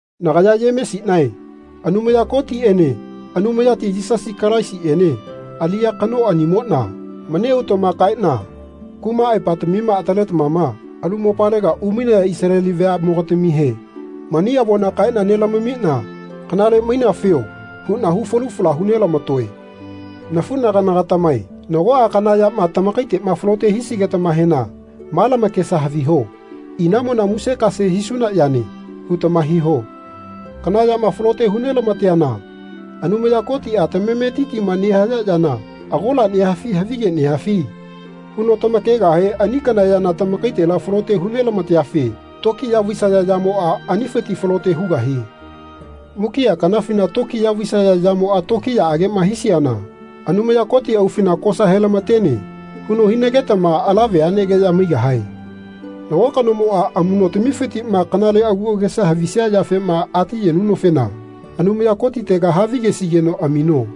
Nagaya Yemesinae Anumaya Kotiene Anumayati Yisasi Kalaisiene aliya kanoanimona mani autama kaena kuma aepatamima ataletamama alu mopalega umainaya Isaleli veamogatamihe mani avona kaena nelamamina kanale mainafio huna hu falu fala hu nelamatoe. Nafunagana-gatamae nagoa kana yama tamakaitema falote hisigetamahena ma lamakesa haviho Inamona musekase hisuna yane. hutama hiho. Kana yama falote hulamateana Anumaya Kotia Tamametitima nehaya yana agola nehafi havige nehafi? huno tamakegahe ani kana yana tamakaitela falote hu nelamateafe tokiya vaisaya yamoa anifiti falote hugahie. Mukia kanafina tokiya vaisaya yamoa tokiyaagema hisiana Anumaya Koti aufina Kosa helamatene. huno hinagetama ala veanegeya maigahae. Nago kanomoa amunotamifitima kanale agu agesa havisia yafema ati yenunofena Anumaya Kotitega havigesigeno amino.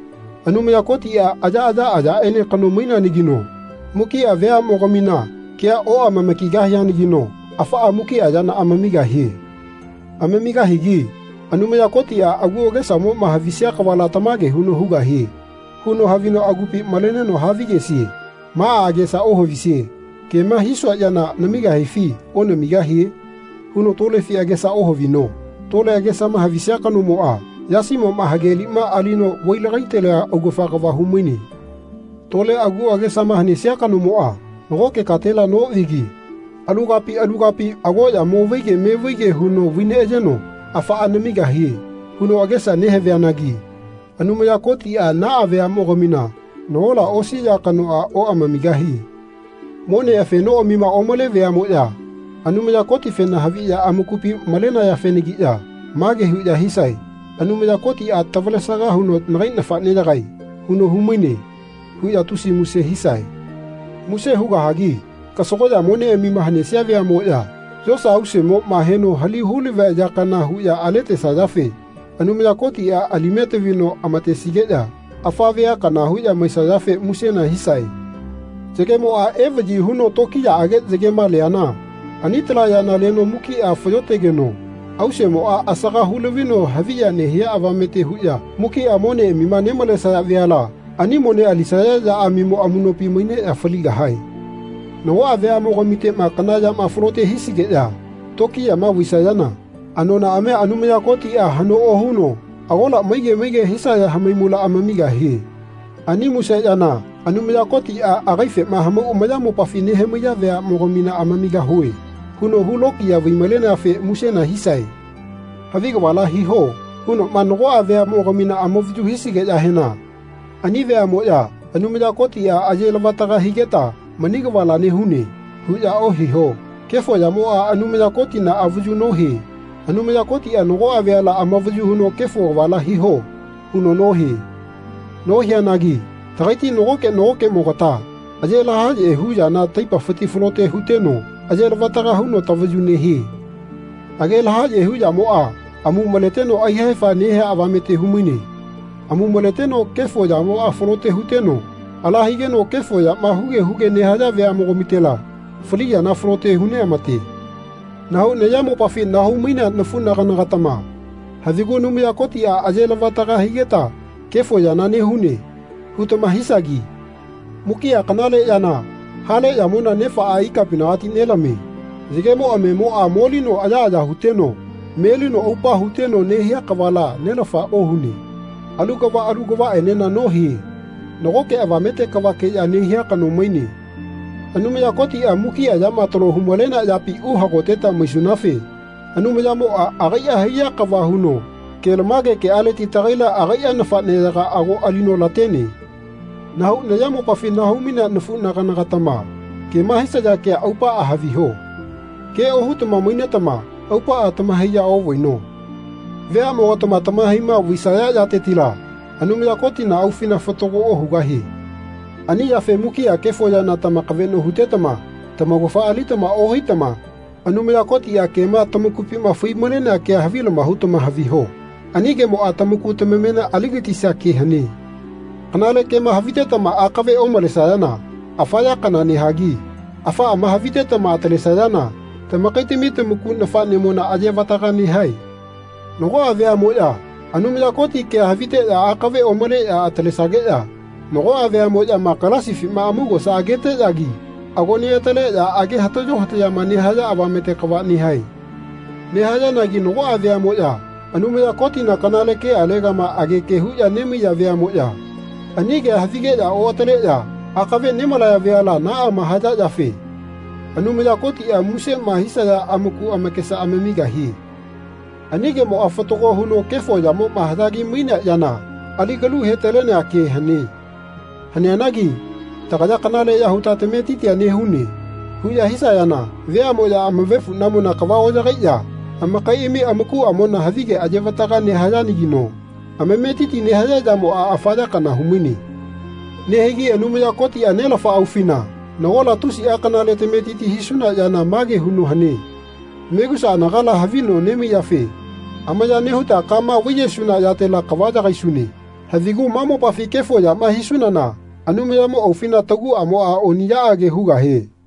Anumaya Kotia ayaaya ayaene kano maineanagino mukia veamogaminakea oamama-kigahianagino afaa mukia yana amamigahie. Amamigahigi Anumaya Kotia agu agesamoma havisia kavala tamage huno hugahie. huno havino agupi maleneno havigesie. Maa agesa ohavisie Kema hisua yana namigahifi onamigahie? huno tolefina agesa ohavino. Tole agesama havisia kanomoa yasimoma hage lima alino vai-lagaitalea augafa kava humaine. Tole agu agesama hanesia kanomoa nagoke katela novigi alu kapi alu kapi agoya mo vaige me vaige huno vai neayeno Afaa namigahie. huno agesa nehavianagi Anumaya Kotia naa veamogamina nagola osi ya kanoa oamamigahie. Mone afenoamima omale veamoya Anumaya Kotifena haviya amakupi malenayafenagiya mage huya hisae Anumaya Kotia tavalesaga huno Nagai nafaneyagae. huno humaine. huya tusi muse hisae. Muse hugahagi kasagoya moneamima hanesia veamoya yosa ausemoma heno hali hulavia ya kana huya aletesayafe Anumaya Kotia alime tavino amatesigeya afa vea kana huya maisayafe musena hisae. Yagemoa evayi huno tokiyaage yagema leana ani tala yana leno mukia fayotegeno auseamoa asaga hu lavino haviya nehia avamete huya mukia moneamima nemalesaya veala ani mone alisaya yaamimo amunopi maineya faligahae. Nagoa veamogamitema kana yama falote hisigeya tokiyama vaisayana anonaamia Anumaya Kotia hano ohuno agola maige maige hisaya hamaimula amamigahie. Ani muse yana Anumaya Kotia agaifema hamau ayamopafi nehamaiya veamogamina Amamigahue. huno hu lokiya vai-maleneafe musena hisae. Havi kavala hiho. hunoma nagoa veamogamina amavayu hisigeyahena ani veamoya Anumaya Kotia aye lavataka higeta mani kavala nehune. huya ohiho. Kefo yamoa Anumaya Kotina avayu nohie. Anumaya Kotia nagoa veala avayu huno Kefo kavala hiho. huno nohie. Nohianagi tagaiti nagoke nagokemogata age lahaye hu yana taipafiti falote huteno aye lavataga huno tavayu nehie. Age lahaye hu yamoa amu maleteno aihefa nehea avamete humaine. Amu maleteno kefo yamoa falote huteno ala higeno kefo yama huge huge nehaya veamogamitela fali yana falote hu neamate. Nahau nayamopafi nahau-mainea nafunagana-gatama havigu Anumaya Kotia aye lavataga higeta kefo yana nehune. hutama hisagi. Mukia kanale yana hale yamona Nefaa ikapinagati nelamie. Yagemo amemoa molino ayaaya huteno melino aupa huteno nehia kavala Nelafa ohune. Alu kava alu kavaenena nohie. Nagoke avamete kavakeya nehia kano maine. Anumaya Kotia mukia yama talo hu-malenea yapi uhagoteta maisunafe Anumayamoa agaia haiya kava huno kelamage kealeti tagaila agaia nafaneyaga ago alino latene. Nahau nayamopafi nahau-mainea nafunagana-gatama kema hisaya kea aupaa haviho. Ke ohutama mainetama aupaa tamahaiya ovaino. Veamogatama tamahaima vaisaya yatetila Anumaya Kotina aufina fatago ohugahie. Ani yafe mukia kefo yana tamakaveno hutetama tamaugafa alitama ohaitama Anumaya Kotia kema tamakupima fai-malenea kea havilama hutama haviho. Ani kemoa tamaku tamamena aligatisia ke hane. Kanale kema havitetama akave omalesayana afa ya kana nehagi afaama havitetama atalesayana tamakaitami tamaku nafanemona aye vataga nehae. Nagoa veamoya Anumaya Koti kea haviteya akave omaleya atalesageya nagoa veamoyama galasifima amaugosa ageteyagi ago neataleya age hatayo hatayama nehaya avamete kava nehae. Nehayanagi nagoa veamoya Anumaya Kotina kanale kealegama ageke huya nemaiya veamoya ani kea havigeya oataleya akave nemalaya veala naama haya yafe Anumaya Kotia musema hisaya amaku amakesa amamigahie. Ani kemoa fatago huno kefo yamoma haya kimainea yana ali kalu hetalenea ke hane. Haneanagi Tagaya kanaleya huta tametitia nehune. huya hisayana veamoya amavefunamona kava oyagaiya amakaiami amakuamona havige ayevataga nehayanagino amametiti nehaya yamoa afa ya kana humaine. Nehigi Anumaya Kotia Nelafa aufina nagola tusia kanale tametiti hisuna yana mage huno hane. Megusa anagala havi no nemaiyafe amaya nehuta kama vaiyesuna yatela kava yagaisune. Havigu ma mopafi kefo yama hisunana Anumayamo aufina taguamoa oniyaage hugahie.